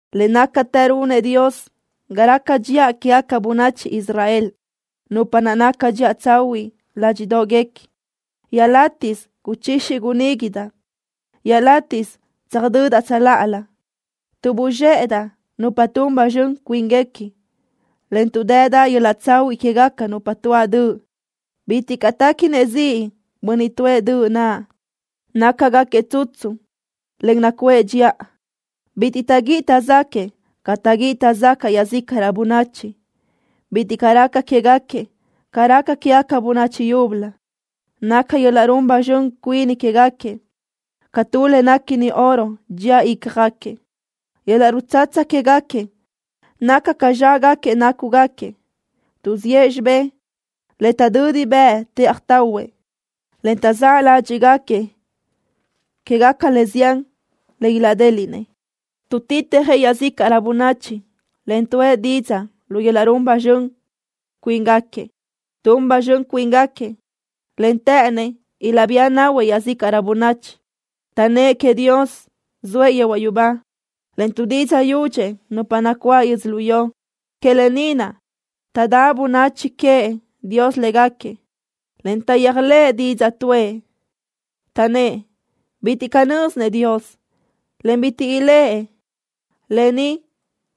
Le nácatë runëʼ Dios ga raca dxiʼa quégaca bönachi Israel, nupa naʼ naca dxiʼa tsahuiʼ ládxiʼdoʼguequi. Iaʼlátiʼsö guchixi guníguidaʼ. Iaʼlátiʼsö tsöjdödaʼ tsöláʼalö, tuʼ buzxéʼedaʼ nupa tun ba zxön cuínguequi, en tuʼ dëdaʼ yöl-laʼ tsahuiʼ quégaca nupa tuáʼ döʼ. Bitiʼ caʼ téquinëʼ ziʼ bönniʼ tuʼë döʼ naʼ. Nácagaquiëʼ tsutsu, en nacuʼë dxiʼa. Bitiʼ taʼguíʼi taʼzáquëʼë ca taʼguíʼi taʼzacaʼ iaʼzícaʼrö bönachi. Bitiʼ caʼ raca quégaquiëʼ ca raca quégaca bönachi yúbölö. Naca yöl-laʼ run ba zxön cuini quégaquiëʼ ca tu le néquini oro dxía ícjagaquiëʼ. Yöl-laʼ rutsatsa quégaquiëʼ naca ca zxágaquiëʼ nácugaquiëʼ. Tuʼziʼë xibé le taʼdödi bëʼë tëʼaj tahuëʼ, en taʼzáʼ ládxiʼgaquiëʼ quégaca le zián le ilaʼdéliʼnëʼ. Tuʼtitjëʼ iaʼzícaʼrö bönachi, en tuʼë didzaʼ lu yöl-laʼ run ba zxön cuini quégaquiëʼ. Tun ba zxön cuíngaquiëʼ, en të́ʼënëʼ ilaʼbía nahuëʼ iaʼzícaʼrö bönachi. Taʼnnë́ʼ queëʼ Dios zoëʼ yehuaʼ yubá, en tuʼdidzaʼ yudxëʼ nupa nacuáʼ yödzölió. Que lë ni naʼ taʼdáʼ bönachi queëʼ Dios légaquiëʼ, en taʼyéajlëʼ didzaʼ tuʼë. Taʼnnë́ʼ: “Bitiʼ caʼ nö́zinëʼ Dios, en bitiʼ iléʼe lë ni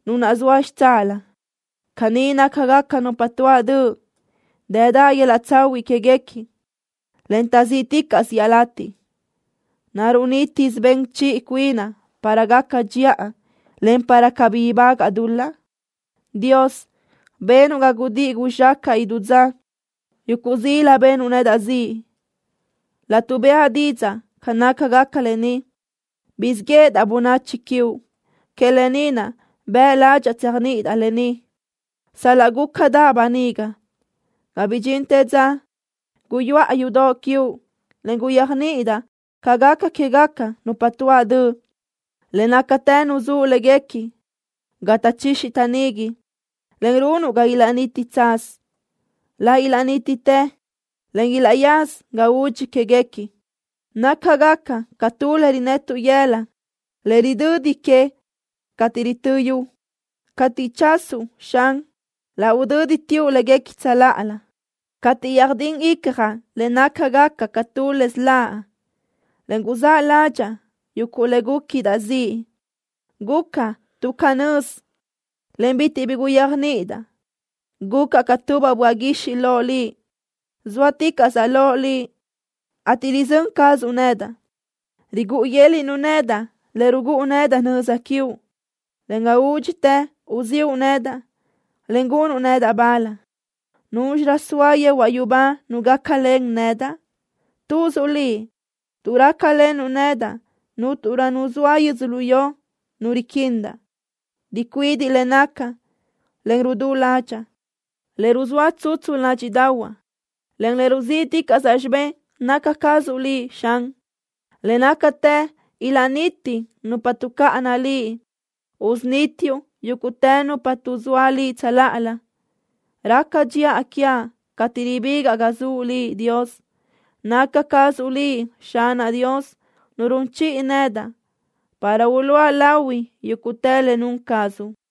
Nu naʼ zoa xitsáʼalö.” Caní nácagaca nupa tuáʼ döʼ. Dëdaʼ yöl-laʼ tsahuiʼ quéguequi, en taʼzíʼticaʼsö iaʼlatiʼ. ¿Naruʼ nítisö ben chiʼi cuinaʼ para gacaʼ dxiʼa en para cabí ibágaʼa dul-laʼ? Dios, benuʼ ga gudíʼi guzxácaʼa idú dza. Yuguʼ zila benuʼ nedaʼ ziʼ. Laʼtuʼ bëʼa didzaʼ ca nácagaca lë ni guzxíʼ yéʼedaʼ bönachi quiuʼ. Que lë ni naʼ bëʼ ládxaʼa tséajniʼidaʼ lë ni, sal-laʼ gúcadaʼ böniga ga bidxintë dza guyuʼa yudoʼ quiuʼ en guyéajniʼidaʼ ca gaca quégaca nupa tuáʼ döʼ. Le nácatë nuzúʼ léguequi ga taʼchixi taʼnigui, en runuʼ ga ilaʼniti tsaz. Laʼ ilaʼnítitë, en ilaʼyaza ga udxi quéguequi. Nácagaca ca tu le rinetuʼ yëla le ridödi que cateʼ ritö́ yu. Cateʼ chasuʼ, Xan, laʼ udö́diteuʼ léguequi tsöláʼalö. Cateʼ yöjdín icjaʼ le nácagaca ca tu le siláʼ, en guzáʼ ládxaʼa yuguʼ le gúquidaʼ ziʼ, gucaʼ tuʼ canö́z, en bitiʼ bi guyéajniʼidaʼ. Gucaʼ ca tubaʼ böaʼ guixiʼ loʼ Liʼ. Zóaticaʼsaʼ loʼ Liʼ, ateʼ rizö́n cazuʼ nedaʼ. Rigúʼu yö́l-luʼu nedaʼ le rugúʼu nedaʼ nöza quiuʼ, en ga údxitë uziʼu nedaʼ, en gunuʼ nedaʼ bal. ¿Núzxirö zoa yehuaʼ yubá nu gácalen nedaʼ? ¡Tuzuʼ Liʼ! Tuʼ rácalenuʼ nedaʼ cúnturö nu zoa yödzölió nu riquindaʼ. Ricuidiʼ le nacaʼ, en rudú ládxaʼa. Le ruzóa tsutsu ládxiʼdaʼahuaʼ, en le ruzíʼticaʼsaʼ xibé naca cazuʼ Liʼ, Xan. Le nácatë ilaʼniti nupa tuʼcáʼana Liʼ. Usunítiuʼ yúguʼtë nupa tuʼzóa Liʼ tsöláʼalö. Raca dxiʼa quiaʼ cateʼ ribigaʼ ga zuʼ Liʼ, Dios. ¡Naca cazuʼ Liʼ, Xanaʼ Dios, Nu run chiʼi nedaʼ para uluʼa lahui yúguʼtë le nun cazuʼ!